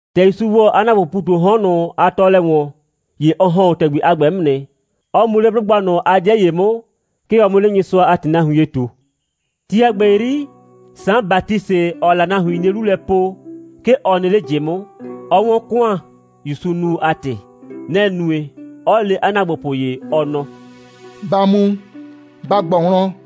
‑Tɛ ‑Yusu ‑wɔ 'a ‑naagbopʋʋ ‑pu ꞊tu 'o 'hɔn ꞊nʋ a tɔɔlɛ ‑wɔn, ‑ye ɔ ‑hɔn 'o ‑tɛgbi a ‑gbɛ 'mʋ nɩ, 'ɔ mu 'le 'blʋgba ꞊nʋ a 'dɩɛ ‑ye 'mʋ, 'ke ɔ 'mʋ 'le Nyɩsʋa a ‑tɩ nahuin ye ꞊tu. Ti a ‑gbɛ 'yri, Saan Batisɩ, ‑ɔɔ la nahuin 'nie 'lu lɛ po, 'ke ɔ nɩ 'le ꞊jɩ 'mʋ, 'ɔ 'wɔn ‑kʋan, ‑Yusuu nu a ‑tɩ. Nɛ‑ nue, 'ɔ le 'a ‑naagbopʋ ‑ye, ɔ nɔ: «Ba mu, ba ꞊gbɔ wlɔn,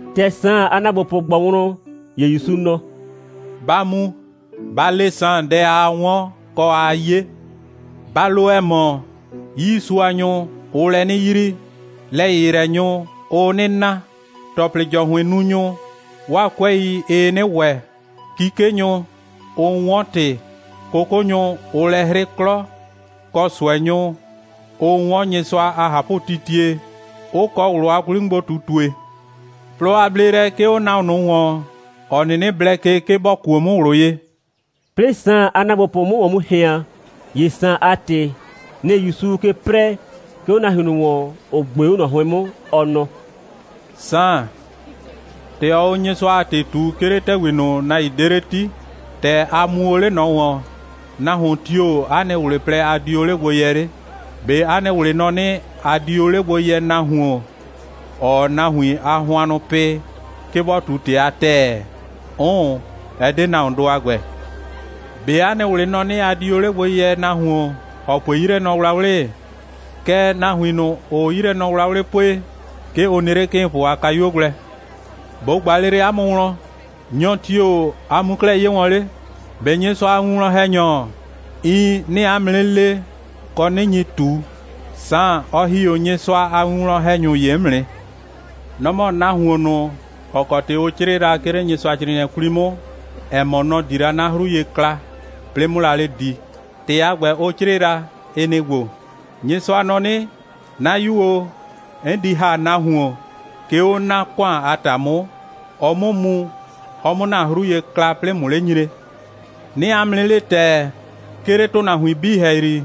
‑Tɛ Saan a ‑naagbopʋ ꞊gbɔ wlɔn, ‑ye ‑Yusu nɔ: «Ba mu, ba le Saan dɛ aa 'wɔn, kɔ, aa 'ye. Ba lo, ‑ɛ mɔ, 'yiisuanyʋ, ʋʋ lɛ 'nɩ yrii, lɛ‑yɩyrɛnyʋ, ʋʋ 'nɩ na, ‑tɔplɩ‑jɔhʋɩnnunyʋ, 'waa 'kʋɛi, ɩɩ 'nɩ ‑wɛ, 'kikenyʋ, ʋʋ 'wɔn ‑tɩ, 'kʋkʋnyʋ, ʋʋ lɛ 'hrɩ 'klɔ, kɔ ꞊sʋɛnyʋ, ʋʋ 'wɔn Nyɩsʋa a ꞊hapʋtitie, 'ʋ kɔ ꞊wlʋ a 'kwli'mʋgbo꞊tutue. Plɔ a bleelɛ 'ke 'o nahuon ꞊nʋ ‑wɔn, ‑ɔ 'nɩnɩ blɛ ke, 'ke bɔ kuo 'mʋ ꞊wlʋ ye.» 'Plɩɩ Saan a ‑naagbopʋ 'mʋ ‑wɔn ꞊hɩan, ‑ye Saan a ‑tɩ, nɩ‑ ‑Yusuu ke 'prɛɛ, 'ke 'o nahuin ꞊nʋ ‑wɔn, ‑ʋ ꞊gbe 'o ꞊nɔ 'hʋɩn 'mʋ, ɔ nɔ: «Saan, ‑tɛ ɔɔ o Nyɩsʋa a ‑tɩ ꞊tu, 'ke 'le ‑tɛgbi ꞊nʋ, nahuin 'de 'le 'ti, ‑tɛ a mu o 'le ꞊nɔ ‑wɔn, nahuon tio‑ 'a nɩ ꞊wlɩ plɛ, a di o 'le gbo yɛ 'le? ꞊Be 'a nɩ ꞊wlɩ nɔ 'nɩ, a di o 'le gbo yɛ nahuon, ‑ɔɔ nahuin a hʋannʋ pɩ, 'ke bɔ ꞊tu ‑tɩ a ‑tɛɛ? 'Ʋʋn, ɛ 'de nahuondʋ a ‑gbɛ. ꞊Be 'a nɩ ꞊wlɩ nɔ 'nɩ, a di o 'le gbo yɛ nahuon, ‑ɔ pue 'yilɛnɔwlawlɩ? Kɛɛ, nahuin ꞊nʋ, ‑ʋʋ 'yilɛnɔwlawlɩ pue, 'ke ʋ nɩ 'le 'kɩɩnpʋ a kayuo gblɛ. ꞊Bo ꞊gba lele 'a mʋ wlɔn: Nyɔ tio‑ a mu o 'klɛɛ 'ye wɔn 'le? ꞊Be Nyɩsʋa a winwlɔn‑hɛnyɔ? Iin, 'nɩɩ 'a mʋ 'nɩ le, kɔ, 'nɩ nyi ꞊tu, Saan, ɔ ‑hi 'o Nyɩsʋa a winwlɔn‑hɛnyʋ ‑ye 'mʋ nɩ. Nɔ‑ mɔ nahuon ꞊nʋ, ‑ɔ kɔ ‑tɩ ʋ 'crɩɩ la, 'ke 'le Nyɩsʋacrɩɩnɩɛ 'kwli 'mʋ, ‑ɛ mɔ, nɔ‑ di la 'na 'hru ye kla, 'plɩɩ 'mʋ la 'le di. ‑Tɩ a ‑gbɛ, ʋ 'crɩɩ la, ɩ nɩ‑ ‑gbo: Nyɩsʋa nɔ 'nɩ: 'Na 'yu o, 'n di ‑ha nahuon, 'ke 'o 'na ‑kʋan a ‑ta 'mʋ, ɔ 'mʋ mu, ɔ 'mʋ ‑na 'hru ye kla, 'plɩɩ ꞊mʋ 'le nyre. 'Nɩɩ 'a mʋ 'nɩ le ‑tɛɛ, 'ke 'le ‑tʋnahuin 'bii ‑hɛyri,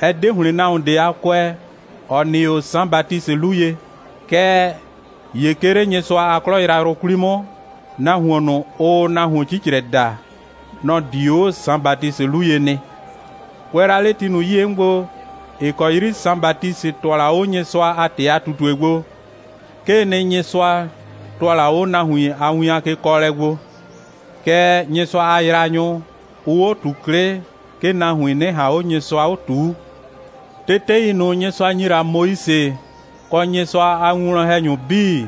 ɛ 'de ‑hlɩn nahuon ꞊de a kʋɛ, ‑ɔ nɩ 'o Saan Batisɩ 'lu ye. Kɛɛ ‑ye 'ke 'le Nyɩsʋa a 'klɔ yrayrʋ 'kwli 'mʋ, nahuon ꞊nʋ, ʋʋ nahuon 'cicrɛ daa, nɔ‑ di 'o Saan Batisɩ 'lu ye nɩ. Kʋɛ la 'le ti ꞊nʋ 'yie 'mʋ gbo, ‑ɩ kɔ 'yri Saan Batisɩ ‑tʋa la 'o Nyɩsʋa a ‑tɩ a ꞊tutue gbo, 'kee nɩ, Nyɩsʋa ‑tʋa la 'o nahuin a win a kekɔɔlɛ gbo, kɛɛ, Nyɩsʋa a yraanyʋ, ʋʋ 'o ꞊tu 'klɩ, 'ke nahuin 'nɩ ꞊han 'o Nyɩsʋa 'o ꞊tuu. Tetei ꞊nʋ, Nyɩsʋa ‑nyi la Moise, kɔ Nyɩsʋa a winwlɔn‑hɛnyʋ 'bii,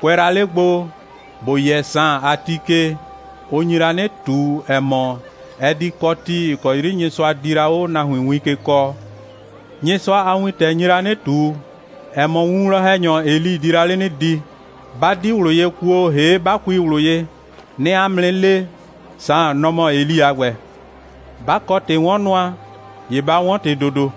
kʋɛ la 'le gbo, ‑bo yɛ Saan a ti ke, ʋ nyi la 'nɩ ꞊tu, ‑ɛ mɔ, ɛ di kɔ ti, ‑ɩ kɔ 'yri Nyɩsʋa di la 'o nahuin win ke kɔɔ. Nyɩsʋa a wintɛ, nɩ‑ nyi la ꞊tu, ‑ɛ mɔ, winwlɔn‑hɛnyɔ Eli di la 'le 'nɩ di. 'Ba 'di ꞊wlʋ ye kuo, ‑hee' 'ba kui ꞊wlʋ ye, 'nɩɩ 'a mʋ 'nɩ le, Saan, nɔ‑ mɔ Eli a ‑gbɛ. 'Ba kɔ ‑tɩ'wɔnnʋa, ‑ye ba 'wɔn ‑tɩ ‑dodo.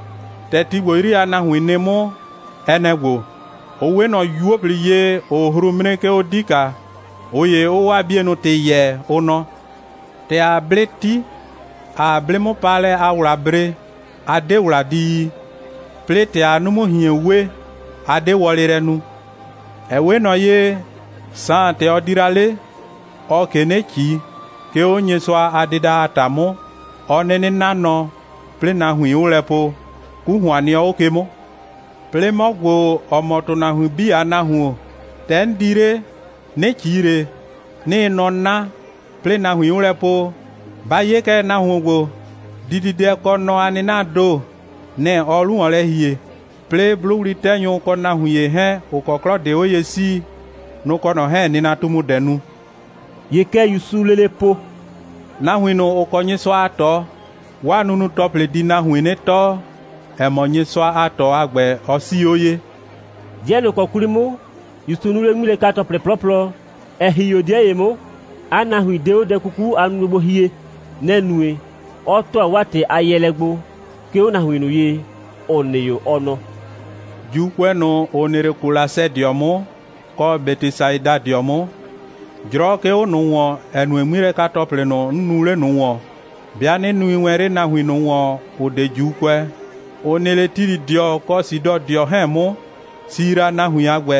‑Tɛ ti ‑gbo 'yri a nahuin nɩ 'mʋ, ɛ nɛ‑ ‑gbo: Ʋ 'we ꞊nɔ 'yuo꞊pli ye, ‑ʋʋ hru 'mre, 'ke 'o 'dika, ꞊ʋ ‑ye 'ʋʋ 'waa 'bienʋ ‑tɩ yɛɛ, ʋ nɔ: ‑Tɛ ‑aa 'blɩ 'ti, ‑aa 'blɩ'mʋpaalɛ a ‑wla bre, a 'de ‑wla di yi. 'Plɩɩ ‑tɛ ‑aa 'numu꞊hien we, a 'de wɔlɩ lɛ nu. Ɛ 'we ꞊nɔ ye, Saan, ‑tɛ ɔ di la 'le, ɔɔ ꞊ke 'nɩ ꞊ci, 'ke 'o Nyɩsʋa a dɩda a ‑ta 'mʋ, 'ɔ 'nɩnɩ 'na nɔ, 'plɩɩ nahuin 'ʋʋ lɛ po: 'Ku ‑hʋan nɩɔ 'o ke 'mʋ. 'Plɩɩ 'mɔ ‑gbo, ‑ɔ mɔ ‑tʋnahuin 'bii a Nahuon, ‑tɛ 'n di 'le, 'nɩ ꞊ci ꞊le, 'nɩɩ nɔ 'na, 'plɩɩ nahuin 'ʋʋ lɛ po: Ba 'ye kɛ, nahuon ‑gbo, dididɛ kɔ nɔ a 'nɩnaa ‑do, nɛ‑ ɔɔ 'lu ‑wɔn lɛ ‑hie, 'plɩɩ 'blʋwli'tɛnyʋ kɔ nahuin ‑ye 'hɛɛn, ‑ʋ kɔ 'klɔ, ‑ʋ 'de 'o ye 'sii, nʋ‑ kɔ ꞊nɔ 'hɛɛn‑ nɩnatumudɛ nu.» ‑Ye kɛ ‑Yusuu lele po: «Nahuin ꞊nʋ, ‑ʋ kɔ Nyɩsʋa a ꞊tɔ, 'waa nunu‑tɔplɩ di nahuin 'nɩ tɔɔ, ‑ɛ mɔ, Nyɩsʋa a ꞊tɔ a ‑gbɛ, ɔ 'sii 'o ye.» 'Dɩɛ ꞊nʋ ‑kɔ 'kwli 'mʋ, ‑Yusu nuu 'le 'ŋmilɛka‑tɔplɩ 'plɔplɔ, ‑ɛ ‑hi 'o 'dɩɛ ‑ye 'mʋ, 'a nahuin 'de 'o dɛ 'kuku a nunue gbo hie. Nɛ‑ nue, 'ɔ ‑tʋa 'waa ‑tɩ a yɛɛlɛ gbo, 'ke 'o nahuin ꞊nʋ ye, ‑ʋ nɩ 'o, ɔ nɔ: «‑Juukʋɛ ꞊nʋ, ‑ʋ nɩ 'le Kolasɛdɩɔ 'mʋ, kɔ Bɛtɩsaidadɩɔ 'mʋ, 'jrɔ 'ke 'o ꞊nʋ ‑wɔn, ‑ɛ nue, 'ŋmilɛka‑tɔplɩ ꞊nʋ, 'n nuu 'le ꞊nʋ ‑wɔn, 'bɩa 'nɩ nui wɛn 'le nahuin ꞊nʋ ‑wɔn, ‑ʋ 'de ‑Juukʋɛ, ‑ʋ nɩ 'le Tilɩdɩɔ kɔ Sidɔdɩɔ 'hɛɛn 'mʋ, si la, nahuin a ‑gbɛ,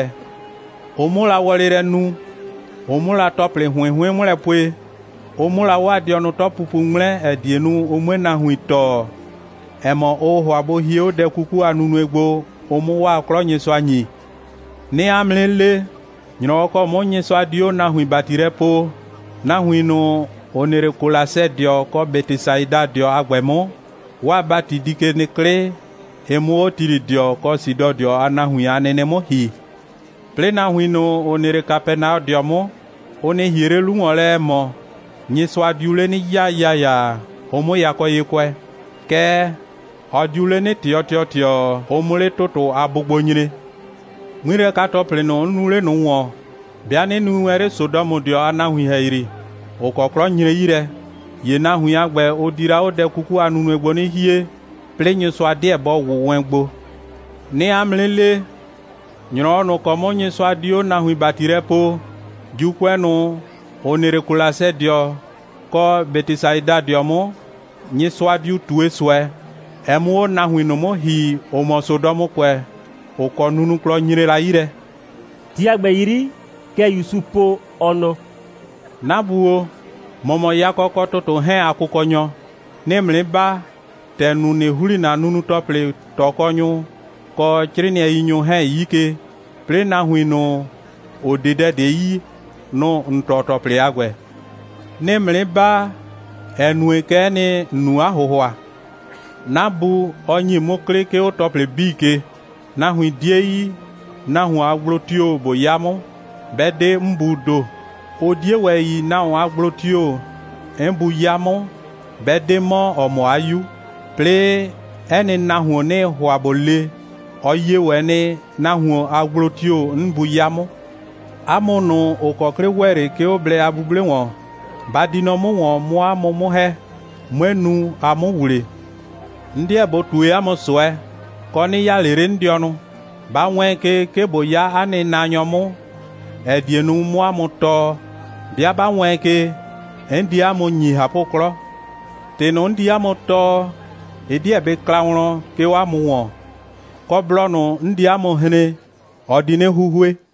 ʋ 'mʋ la wɔlɩ lɛ nu, ʋ 'mʋ la ‑tɔplɩ ‑hʋɩn 'hʋɩn 'mʋ lɛ pue, ʋ 'mʋ la 'waa dɩɔnʋ 'tɔpupu 'ŋmlɛ, ‑ɛ die nu, ʋ 'mue nahuin tɔɔ, ‑ɛ mɔ, ʋʋ ‑hʋa bʋ hie 'o dɛ 'kuku a nunue gbo, ʋ 'mʋ 'waa 'klɔ Nyɩsʋa ‑nyi. 'Nɩɩ 'a mʋ 'nɩ le, ‑nyrɔwɔ ‑kɔ 'mʋ Nyɩsʋa di 'o nahuin ‑bati lɛ poo, nahuin ꞊nʋ, ‑ʋ nɩ 'le Kolasɛdɩɔ kɔ Bɛtɩsaidadɩɔ a ‑gbɛ 'mʋ, 'waa ‑bati di ke nɩ 'klɩ, ɩ 'mʋ 'o Tilɩdɩɔ kɔ Sidɔdɩɔ a nahuin a nɩnɩ 'mʋ ‑hi. 'Plɩɩ nahuin ꞊nʋ, ‑ʋ nɩ 'le Kapɛnaɔdɩɔ 'mʋ, ʋ nɩ ‑hie 'le 'lu ‑wɔn lɛ, ‑ɛ mɔ, Nyɩsʋa diu 'le 'nɩ 'yaa ‑yaayaa, ʋ 'mʋ yakɔ ye kʋɛ. Kɛɛ, ɔ diu 'le 'nɩ ꞊tɩɔ ‑tɩɔtɩɔ, ʋ 'mʋ 'le ‑tʋtʋ a bʋgbo nyre. 'Ŋmilɛka‑tɔplɩ ꞊nʋ, 'n nuu 'le ꞊nʋ ‑wɔn, 'bɩa 'nɩ nui wɛn 'le Sodɔmʋdɩɔ a nahuin ‑hɛyri, ‑ʋ kɔ 'klɔ nyre 'yi lɛ, ‑ye nahuin a ‑gbɛ, ʋ di la 'o dɛ 'kuku a nunue gbo 'nɩ hie, 'plɩɩ Nyɩsʋa 'deɛ bɔ ‑wʋ wɛn gbo. 'Nɩɩ 'a mʋ 'nɩ le, ‑nyrɔwɔ ꞊nʋ ‑kɔ 'mʋ Nyɩsʋa di 'o nahuin ‑bati lɛ poo, ‑Juukʋɛ ꞊nʋ, ‑ʋ nɩ 'le Kolasɛdɩɔ 'mʋ, kɔ Bɛtɩsaidadɩɔ 'mʋ, Nyɩsʋa diu ꞊tue ꞊sʋɛ, ɛ 'mʋ 'o nahuin ꞊nʋ 'mʋ ‑hi, ‑ʋ mɔ Sodɔmʋkʋɛ, ‑ʋ kɔ nunuklɔ nyre la 'yi lɛ.» Ti a ‑gbɛ 'yri, kɛ ‑Yusu po, ɔ nɔ: «'Na Bu o, ‑mɔ mɔ yakɔ kɔ ‑tʋtʋ 'hɛɛn a Kʋkɔnyɔ. 'Nɩɩ ‑mʋ 'nɩ baa, ‑tɛ ‑n nu, ꞊nɩ ‑hli ‑na nunu‑tɔplɩ ꞊tɔkɔnyʋ, kɔ 'crɩɩnɩɛiyinyʋ 'hɛɛn 'yi ke, 'plɩɩ nahuin ꞊nʋ, ‑ʋ 'de dɛ ꞊de yi, nʋ‑ ‑n tɔɔ ‑tɔplɩ a ‑gbɛ. 'Nɩɩ ‑mʋ 'nɩ baa, ‑ɛ nue, kɛ'ɛ nɩ, ‑n nu 'a ‑hʋhʋa. 'Na Bu, ɔ ‑nyi 'mʋ 'klɩ, 'ke 'o ‑tɔplɩ 'bii ke. Nahuin 'die yi, nahuon a gblo tio‑ ꞊bo 'ya 'mʋ, 'bɛ 'de 'n Buu ‑do. Ʋ 'die ‑wɛ yi, nahuon a gblo tio‑ 'n Bu 'ya 'mʋ, 'bɛ 'de 'mɔ, ‑ɔ mɔ 'a 'Yu. 'Plɩɩ 'ɛ nɩ nahuon, 'nɩɩ ‑hʋa ꞊bo le, ɔ yie ‑wɛ nɩ, nahuon a gblo tio‑ 'n Bu 'ya 'mʋ. 'A mʋ ꞊nʋ, ‑ʋ kɔ 'klɩ ‑wɛ 'le, 'ke 'o blɛ a 'buble ‑wɔn, ba di nɔ 'mʋ ‑wɔn, 'mʋ 'a mʋ 'mʋ ‑hɛ, 'mue nu, a 'mʋ ‑wle. 'N 'deɛ ꞊bo ꞊tue 'a mʋ ꞊sʋɛ, kɔ, 'nɩ 'yaa ꞊le 'le 'n dɩɔnʋ. Ba wɛɛn ke, 'ke ꞊bo 'ya 'a nɩ naanyɔ 'mʋ, ‑ɛ die nu, 'mʋ 'a mʋ tɔɔ. 'Bɩa 'ba wɛɛn ke, 'n di 'a mʋ ‑nyi ꞊hapʋ'klɔ. ‑Tɩ ꞊nʋ, 'n di 'a mʋ tɔɔ, ɩ 'deɛ bɩ kla wlɔn, 'ke 'o 'a mʋ ‑wɔn, kɔ, blɔ ꞊nʋ, 'n di 'a mʋ hren, ɔ di 'nɩ 'huhue.»